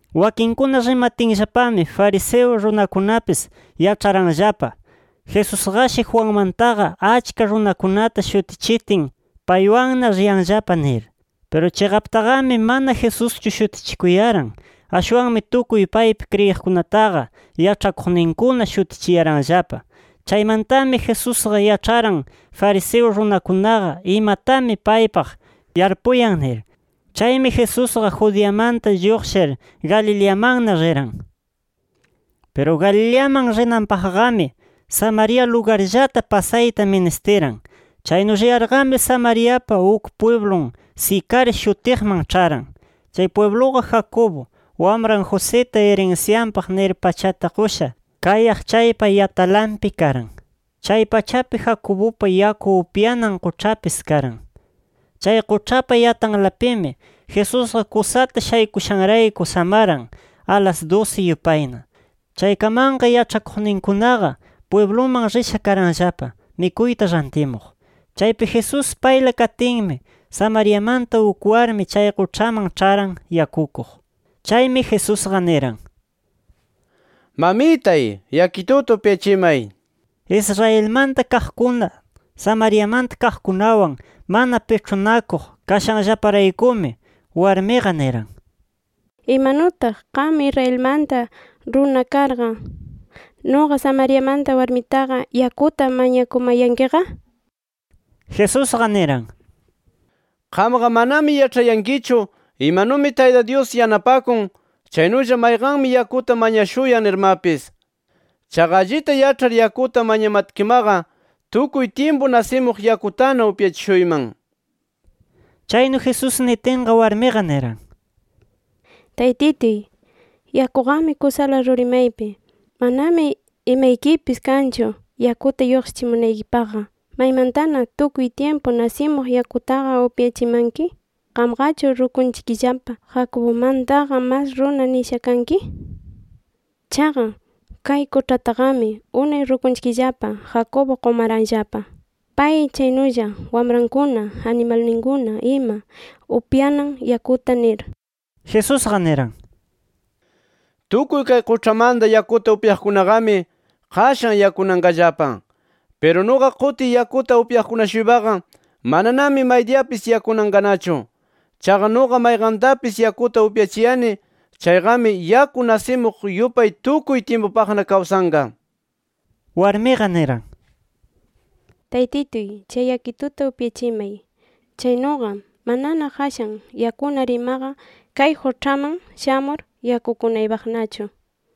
Wakinkuna rimatinllapami fariseo runakunapis yaĉharanllapa, Jesusqashi Juanmantaqa achka runakunata shutichitin, paywanna riyanllapa nir. Piru chiqaptaqami mana Jesuschu shutichikuyaran. Ashwanmi tukuy paypi kriyiqkunataqa yaĉhakuqninkuna shutichiyaranllapa. Chaymantami Jesusqa yaĉharan fariseo runakunaqa imatami paypaq yarpuyan nir. Chaymi Jesusqa Judeamanta lluqshir Galileamanna riran. Piru Galileaman rinanpaqqami, Samaria lugarllata pasayta ministiran. Chaynu riyarqami, Samariapa uk pwiblun Sicar shutiqman ĉharan. Chay pwibluqa Jacobo, wamran Josita irinsyanpaq nir pachata qusha kayaq chaypa yatalanpi karan. Chay pachapi Jacobupa yaku upyanan quĉhapis karan. Chay quĉhapa yatanlapimi, Jesusqa kusata shaykushanrayku samaran, alas dusi yupayna. Chaykamanqa, yaĉhakuqninkunaqa pwibluman risha karanllapa mikuyta rantimuq. Chaypi Jesús payla katinmi, Samariamanta uk warmi chay quĉhaman ĉharan yakukuq. Chaymi Jesusqa niran: —Mamitay, yakituta upyachimay nir. Israelmanta kaqkuna, Samariamanta kaqkunawan mana piĉhunakuq kashanllaparaykumi, warmiqa niran: —¿Imanutaq qam Israelmanta runa karqa, nuqa Samariamanta warmitaqa yakuta mañakumayankiqa? nir. Jesusqa niran: —Qamqa manami yaĉhayankichu imanumi Tayta Dyus yanapakun chaynulla mayqanmi yakuta mañashuyan nirmapis. Chaqa allita yaĉhar yakuta mañamatkimaqa tukuy tyimpu nasimuq yakutana upyachishuyman nir. Chaynu Jesús nitinqa, warmiqa niran: —Taytituy, yakuqami kusala ruri maypi. ¿Manami imaykipis kanchu yakuta lluqshichimunaykipaqqa? ¿Maymantana tukuy tyimpu nasimuq yakutaqa upyachimanki? ¿Qamqachu rukunchikllapa Jacobumantaqa mas runa nisha kanki? Chaqa kay quĉhataqami unay rukunchikllapa Jacobo qumaranllapa, pay chaynulla wamrankuna, animalninkuna ima upyanan yakuta nir. Jesusqa niran: —Tukuy kay quĉhamanta yakuta upyaqkunaqami, qashan yakunanqallapa. Piru nuqa qutiy yakuta upyaqkuna-shuypaqa, mananami maydiyapis yakunanqanachu. Chaqa nuqa mayqantapis yakuta upyachiyani chayqami, yaku nasimuq yupay tukuy tyimpupaqna kawsanqa. Warmiqa niran: —Taytituy, chay yakituta upyachimay. Chaynuqa manana qashan yakunar imaqa, kay quĉhaman shamur yakukunaypaqnachu nir.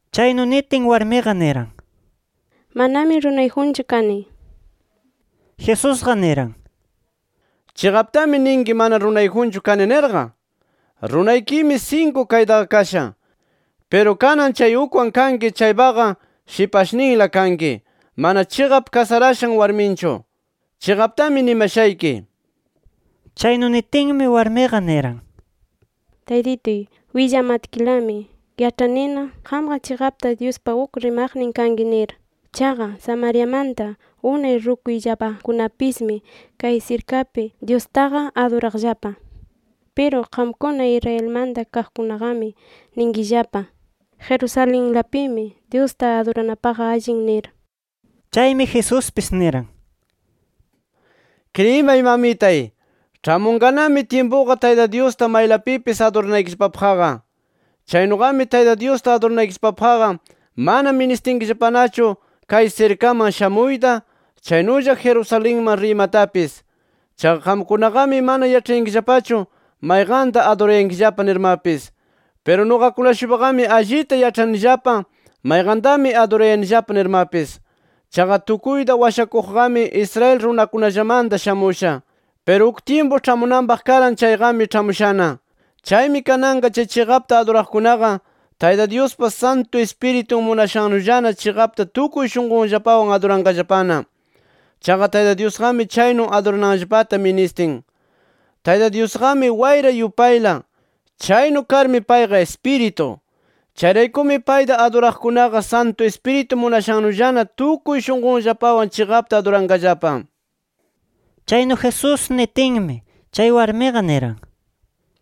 Chaynu nitin, warmiqa niran: —Manami runayjunchu kani nir. Jesusqa niran: —Chiqaptami ninki mana runayjunchu kani nirqa. Runaykimi, sinku kaytaqa kasha, piru kanan chay ukwan kanki chaypaqa shipashninla kanki, mana chiqap kasarashan warminchu. Chiqaptami nimashayki nir. Chaynu nitinmi, warmiqa niran: —Taytituy, willamatkilami yaĉhanina, qamqa chiqapta Dyuspa uk rimaqnin kanki nir. Chaqa Samariamanta unay rukuyllapakunapismi kay sirkapi Dyustaqa aduraqllapa. Piru qamkuna Israelmanta kaqkunaqami ninkillapa: Jerusalenlapimi Dyusta aduranapaqqa allin nir. Chaymi Jesuspis niran: —Kriyimay mamitay, ĉhamunqanami tyimpuqa Tayta Dyusta maylapipis aduranaykillapapaqqa. Chaynuqami Tayta Dyusta aduranaykillapapaqqa mana ministinkillapanachu kay sirkaman shamuyta, chaynulla Jerusalenman riymatapis. Chaqa qamkunaqami mana yaĉhayankillapachu mayqanta adurayankillapa nirmapis. Piru nuqakuna-shuypaqami allita yaĉhanillapa mayqantami adurayanillapa nirmapis. Chaqa tukuyta Washakuqqami Israel runakunallamanta shamusha. Piru uk tyimpu ĉhamunanpaq karan chayqami ĉhamushana. Chaymi kananqa chay chiqapta aduraqkunaqa Tayta Dyuspa Santu Ispiritun munashannullana chiqapta tukuy shunqunllapawan aduranqallapana. Chaqa Tayta Dyusqami chaynu adurananllapata ministin. Tayta Dyusqami wayra yupayla. Chaynu karmi payqa Ispiritu. Chayraykumi payta aduraqkunaqa Santu Ispiritu munashannullana tukuy shunqunllapawan chiqapta aduranqallapa. Chaynu Jesús nitinmi, chay warmiqa niran: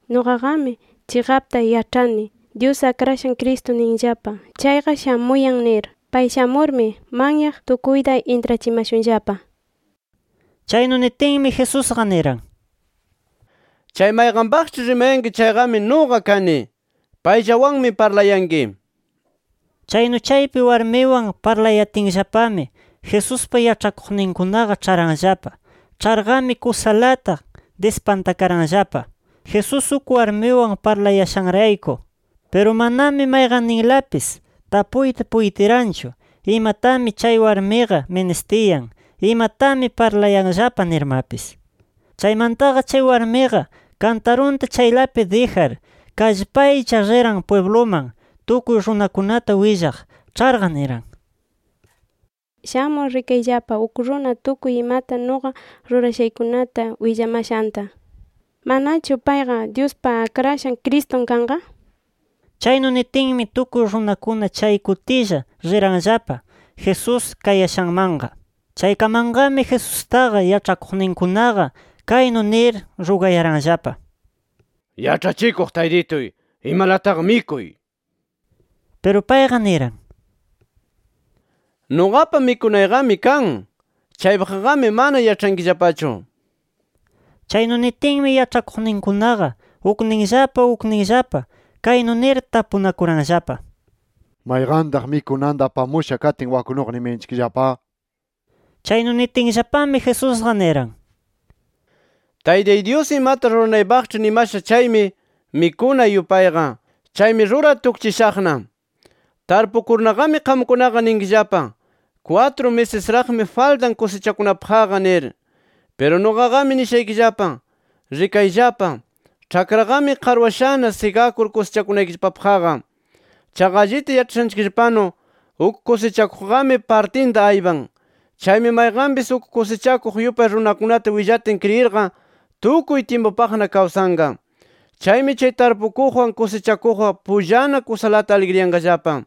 —Nuqaqami chiqapta yaĉhani, Dyus Akrashan Cristo ninllapa chayqa, shamuyan nir. Pay shamurmi, manyaq tukuyta intrachimashunllapa nir. Chaynu nitinmi, Jesusqa niran: —Chay mayqanpaqĉhi rimayanki chayqami, nuqa kani. Payllawanmi parlayanki nir. Chaynu chaypi warmiwan parlayatinllapami, Jesuspa yaĉhakuqninkunaqa ĉharanllapa. Ĉharqami kusalata dispantakaranllapa Jesús uk warmiwan parlayashanrayku. Piru manami mayqanninlapis tapuyta puytiranchu imatami chay warmiqa ministiyan, imatami parlayanllapa nirmapis. Chaymantaqa chay warmiqa kantarunta chaylapi dijar, kallpaylla riran pwibluman tukuy runakunata willaq. Ĉharqa, niran: —Shamur rikayllapa uk runa tukuy imata nuqa rurashaykunata willamashanta. ¿Manachu payqa Dyuspa Akrashan Cristun kanqa? nir. Chaynu nitinmi, tukuy runakuna chay kutilla riranllapa Jesús kayashanmanqa. Chaykamanqami, Jesustaqa yaĉhakuqninkunaqa kaynu nir rugayaranllapa: —Yaĉhachikuq Taytituy, imalataqa mikuy nir. Piru payqa, niran: —Nuqapa mikunayqami kan. Chaypaqqami mana yaĉhankillapachu nir. Chaynu nitinmi yaĉhakuqninkunaqa ukninllapa, ukninllapa kaynu nir tapunakuranllapa: “¿Mayqantaq mikunanta apamusha katin waknuqa nimayanchikllapa?” nir. Chaynu nitinllapami, Jesusqa niran: —Taytay Dyus imata ruranaypaqĉhi nimasha chaymi, mikunay yupayqa. Chaymi rurar tukchishaqna nir. “Tarpukurnaqami qamkunaqa ninkillapa: ‘Kwatru misisraqmi faltan kusichakunapaqqa’ nir. Piru nuqaqami nishaykillapa: Rikayllapa, ĉhakraqami qarwashana sigakur kusichakunaykillapapaqqa. Chaqa allita yaĉhashanchikllapanu uk kusichakuqqami partinta aypan. Chaymi mayqanpis uk kusichakuq yupay runakunata willatin kriyirqa tukuy tyimpupaqna kawsanqa. Chaymi chay tarpukuqwan, kusichakuqqa pullana kusalata aligriyanqallapa.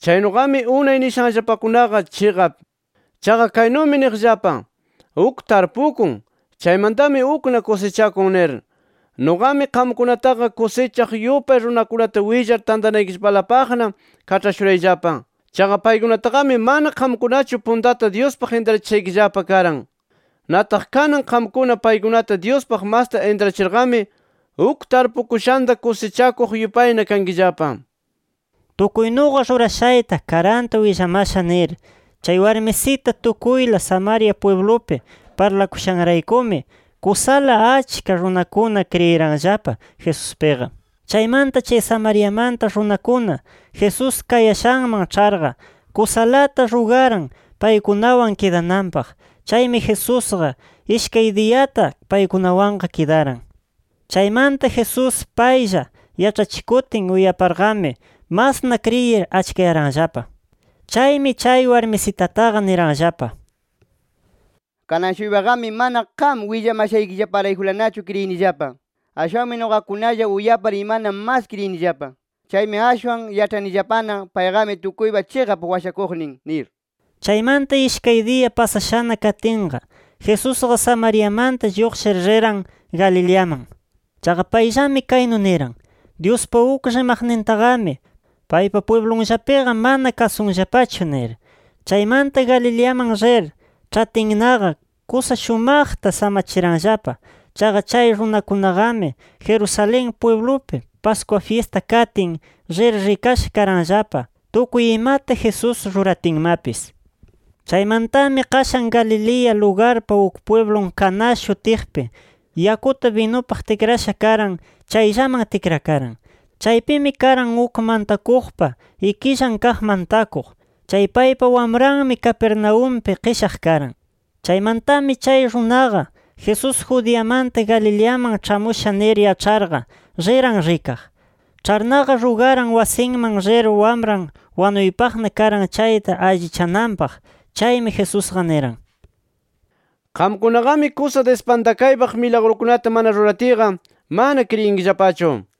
Chaynuqami unay nishanllapakunaqa chiqap. Chaqa kaynumi niqllapa: ‘Ukmi tarpukun, chaymantami ukna kusichakun’ nir. Nuqami qamkunataqa kusichaq yupay runakunata willar tantanaykillapalapaqna kaĉhashurayllapa. Chaqa paykunataqami mana qamkunachu puntata Dyuspaq intrachishaykillapa karan. Nataq kanan qamkuna paykunata Dyuspaq masta intrachirqami uk tarpukushanta kusichakuq yupayna kankillapa”. “Tukuy nuqa rurashayta karanta willamasha” nir, chay warmisita tukuyla Samaria pwiblupi parlakushanraykumi kusala achka runakuna kriyiranllapa Jesuspiqa. Chaymanta chay Samariamanta runakuna Jesús kayashanman ĉharqa, kusalata rugaran paykunawan kidananpaq. Chaymi Jesusqa, ishkay diyata paykunawanqa kidaran. Chaymanta Jesús paylla yaĉhachikutin uyaparqami masna kriyir achkayaranllapa. Chaymi chay warmisitataqa niranllapa: —Kanan-shuypaqami mana qam willamashaykillaparaykulanachu kriyinillapa. Ashwanmi nuqakunalla uyapar imana mas kriyinillapa. Chaymi ashwan yaĉhanillapana, payqami tukuypa chiqap Washakuqnin nir. Chaymanta, ishkay diya pasashana katinqa, Jesusqa Samariamanta lluqshir riran Galileaman. Chaqa payllami kaynu niran: “Dyuspa uk rimaqnintaqami paypa pwiblunllapiqa mana kasunllapachu” nir. Chaymanta Galileaman rir ĉhatinnaqa, kusa shumaqta samachiranllapa. Chaqa chay runakunaqami Jerusalén pwiblupi Pascua fyista katin, rir rikasha karanllapa, tukuy imata Jesús ruratinmapis. Chaymantami qashan Galilea lugarpa uk pwiblun Caná shutiqpi yakuta binupaq tikrasha karan chayllaman tikrakaran. Chaypimi karan uk mantakuqpa ikillan kaq mantakuq. Chay paypa wamranmi, Capernaumpi qishaq karan. Chaymantami chay runaqa, Jesús Judeamanta Galileaman ĉhamusha nir yaĉharqa, riran rikaq. Ĉharnaqa rugaran wasinman rir wamran wanuypaqna karan chayta allichananpaq. Chaymi Jesusqa niran: —Qamkunaqami kusa dispantakaypaq milagrukunata mana ruratiyqa mana kriyinkillapachu.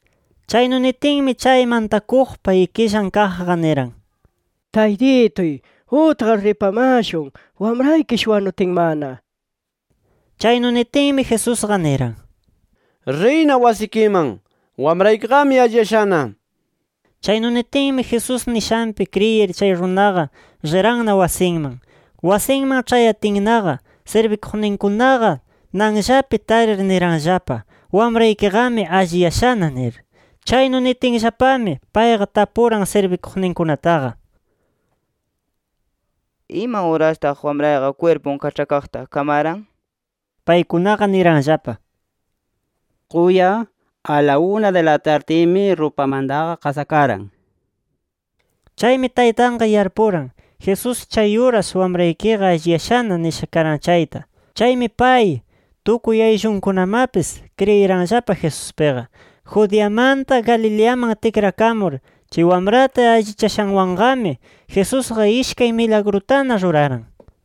Chaynu nitinmi, chay mantakuqpa ikillan kaqqa, niran: —Taytituy, utqar ripamashun, wamraykish wanutinmana nir. Chaynu nitinmi, Jesusqa niran: —Riyna wasikiman. Wamraykiqami alliyashana nir. Chaynu nitinmi, Jesús nishanpi kriyir chay runaqa riranna wasinman. Wasinman ĉhayatinnaqa, sirbikuqninkunaqa nanllapi tarir niranllapa: —¡Wamraykiqami alliyashana! nir. Chaynu nitinllapami, payqa tapuran sirbikuqninkunataqa: —¿Ima urastaq wamrayqa kwirpun kaĉhakaqta kamaran? nir. Paykunaqa niranllapa: —Quya, a la una di la tardimi rupamantaqa qasakaran nir. Chaymi taytanqa yarpuran, Jesús chay uras “Wamraykiqa alliyashana” nisha karan chayta. Chaymi pay, tukuy ayllunkunamapis kriyiranllapa Jesuspiqa. Judeamanta Galileaman tikrakamur chay wamrata allichashanwanqami, Jesusqa ishkay milagrutana ruraran.